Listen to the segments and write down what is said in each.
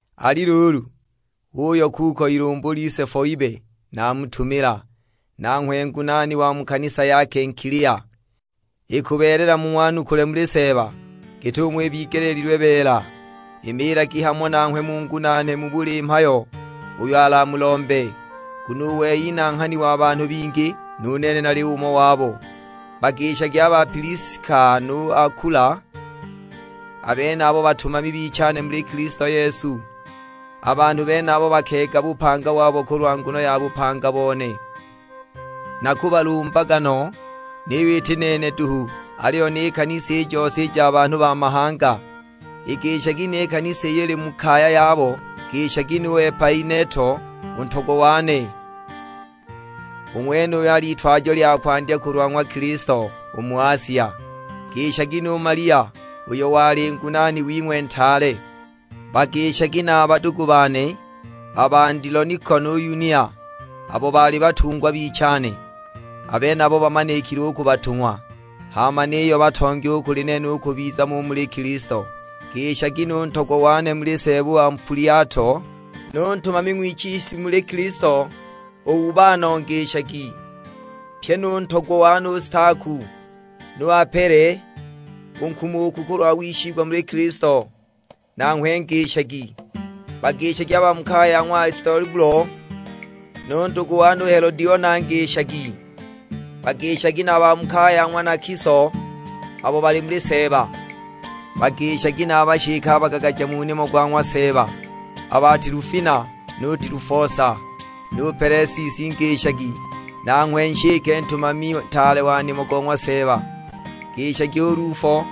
Ali luulu, uuyo kuko ilumbu lise Foibe naamutumila, nanghwe ngunaani wa mu kanisa ya Kenkilia. Ikubeelela mung'wanukule muli Seeba, git'umo ibigeleelilwe beela; imiilagi hamo nanghwe mungunaane mu buli mhayo uyo alamulombe, nguno u wei nanghani wa banhu bingi; nu nene nali umo wabo. Bagishagi a ba Piliska nu Akula, a benabo batumami bichane muli Kilisto Yesu. A banhu benabo bakeega bupanga wabo kulwa nguno ya bupanga bone. Nakubalumbaga no; niyo iti nene duhu, aliyo ni kanisa i jose i ja banhu ba mahanga. Igishagi ni kanisa iyo ili mu kaya yabo. Ngishagi nu Epaineto u ntogwa wane; u ng'wenuyo al'itwajo lya kwandya kulwa ng'wa Kilisto u mu Asia. Ngishagi nu Malia, uyo wali ngunaani wing'we ntaale; Bagishagi na a badugu bane a ba Andiloniko nu Yunia, abo baali batungwa bichane. A benabo bamanikile u ku batung'wa, hama niyo batongi u kuli nene u kubiza mo u muli Kilisto. Ngishagi nu ntogwa wane muli Seeba u Ampuliato; nu ntumami ng'wichiswi muli Kilisto u Ubano ngishagi, pyi nu ntogwa wane u Staku. Nu Apele u nkumuku kulwa wishigwa muli Kilisto, nanghwe ngishagi; bagishagi a ba mu kaya ya ng'wa Alistobulo. Nu ndugu wane u Helodiona ngishagi; bagishagi na a ba mu kaya ya ng'wa Nakiso abo bali muli Seeba. Bagishagi na a bashike a bagagaja mu nimo go ng'wa Seeba, a ba Tilufina nu Tilufosa; nu Pelesisi ngishagi, nanghwe nshike ntumami ntaale wa nimo go ng'wa Seeba. Ngishagi u Lufo,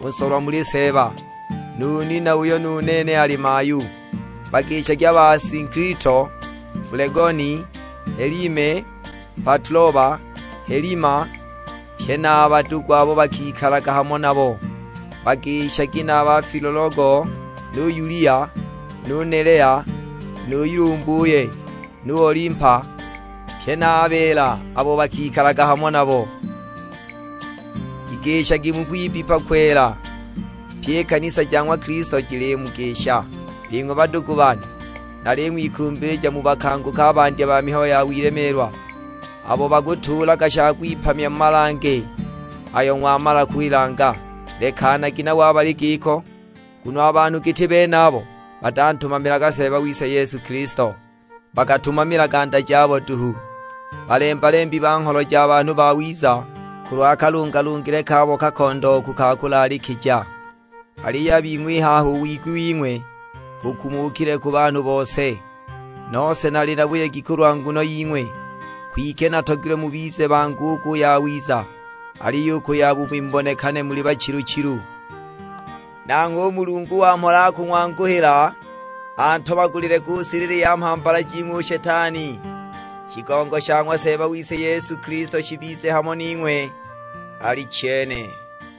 u nsolwa muli Seeba, nu nina, uyo nu nene ali mayu. Bagishagi a ba Asinkilito, Fulegoni, Helime, Patuloba, Helima, pye na a badugu abo bakikalaga hamo nabo. Bagishagi na a ba Filologo nu Yulia, nu Nelea nu ilumbuye, nu Olimpa, pye na a beela abo bakikalaga hamo nabo. Igishagi mu kwibbipa kwela. Pyi i kanisa ja ng'wa Kilisto jilimugisha. Bing'we badugu bane, naling'wikumbilija mubakanguke a bandya ba mihayo ya wilemeelwa; abo bakutuulaga sha kwipamya mu malange ayo ng'wamala kwilanga; lekanagi nabo a bali giko. Nguno a banhu giti benabo batantumamilaga Seeba wise Kilisto, bakatumamilaga nda jabo duhu. Balemba-lembi ba ngholo ja banhu bawiza, kulwa kalungalungile kabo kakondooku ka kulaalikija! Aliyo a bing'we i haha u wigwi wing'we bukumukile ku banhu bose; nose nali na buyegi kulwa nguno ying'we, kwike natogilwe mubize bangu u ku yawiza, aliyo u ku yabubi mubonekane muli bachilu-chilu. Nanghwe u Mulungu wa mhola akung'wanguhila, antobagulile ku silili ya mhambala jing'we u Shetani. Shigongo sha ng'wa Seeba wise Yesu Kilisto shibize hamo ning'we. Alichene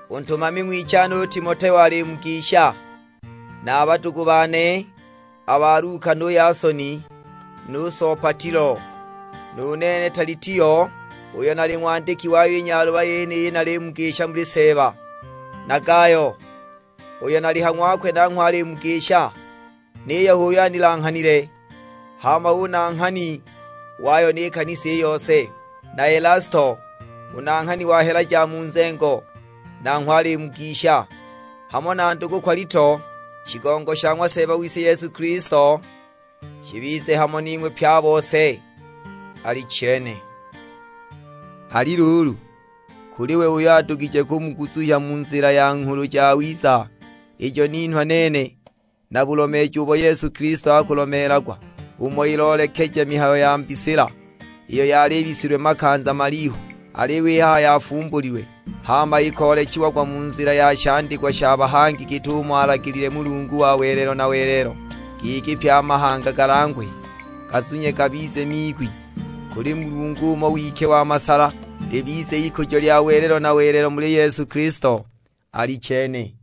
U ntumami ng'wichane u Timoteo alimugisha, na a badugu bane a ba Luka nu Yasoni nu Sopatilo. Nu nene Talitio uyo nali ng'wandiki wayo i nyaluba yeniyi nalimugisha muli Seeba. Na Gayo, uyo nali ha ng'wakwe nanghwe alimugisha, niyo h'uyo anilanghanile; hama hu nanghani wayo ni kanisa i yose. Na Elasto, u nanghani wa hela ja mu nzengo, nanghwe alimugisha, hamo na ndugu Kwalito. Shigongo sha ng'wa Seeba wise Yesu Kilisto shibize hamo ning'we pye a bose: Alichene. Ali luulu, kuli we uyo adugije kumuguzuhya mu nzila ya Nghulu Jawiza ijo ninhwa nene, na bulomeeji ubo Yesu Kilisto akulomeelagwa, umo iloolekeja mihayo ya mbisila iyo yali ibisilwe makanza malihu, aliyo i haha yafumbulilwe; hama ikoolechiagwa mu nzila ya shandikwa sha bahangi git'umo alagilile Mulungu wa welelo na welelo, giki pye a mahanga galangwe, gazunye gabize miigwi. Kuli Mulungu umo we wike wa masala, libize ikujo lya welelo na welelo muli Yesu Kilisto: Alichene.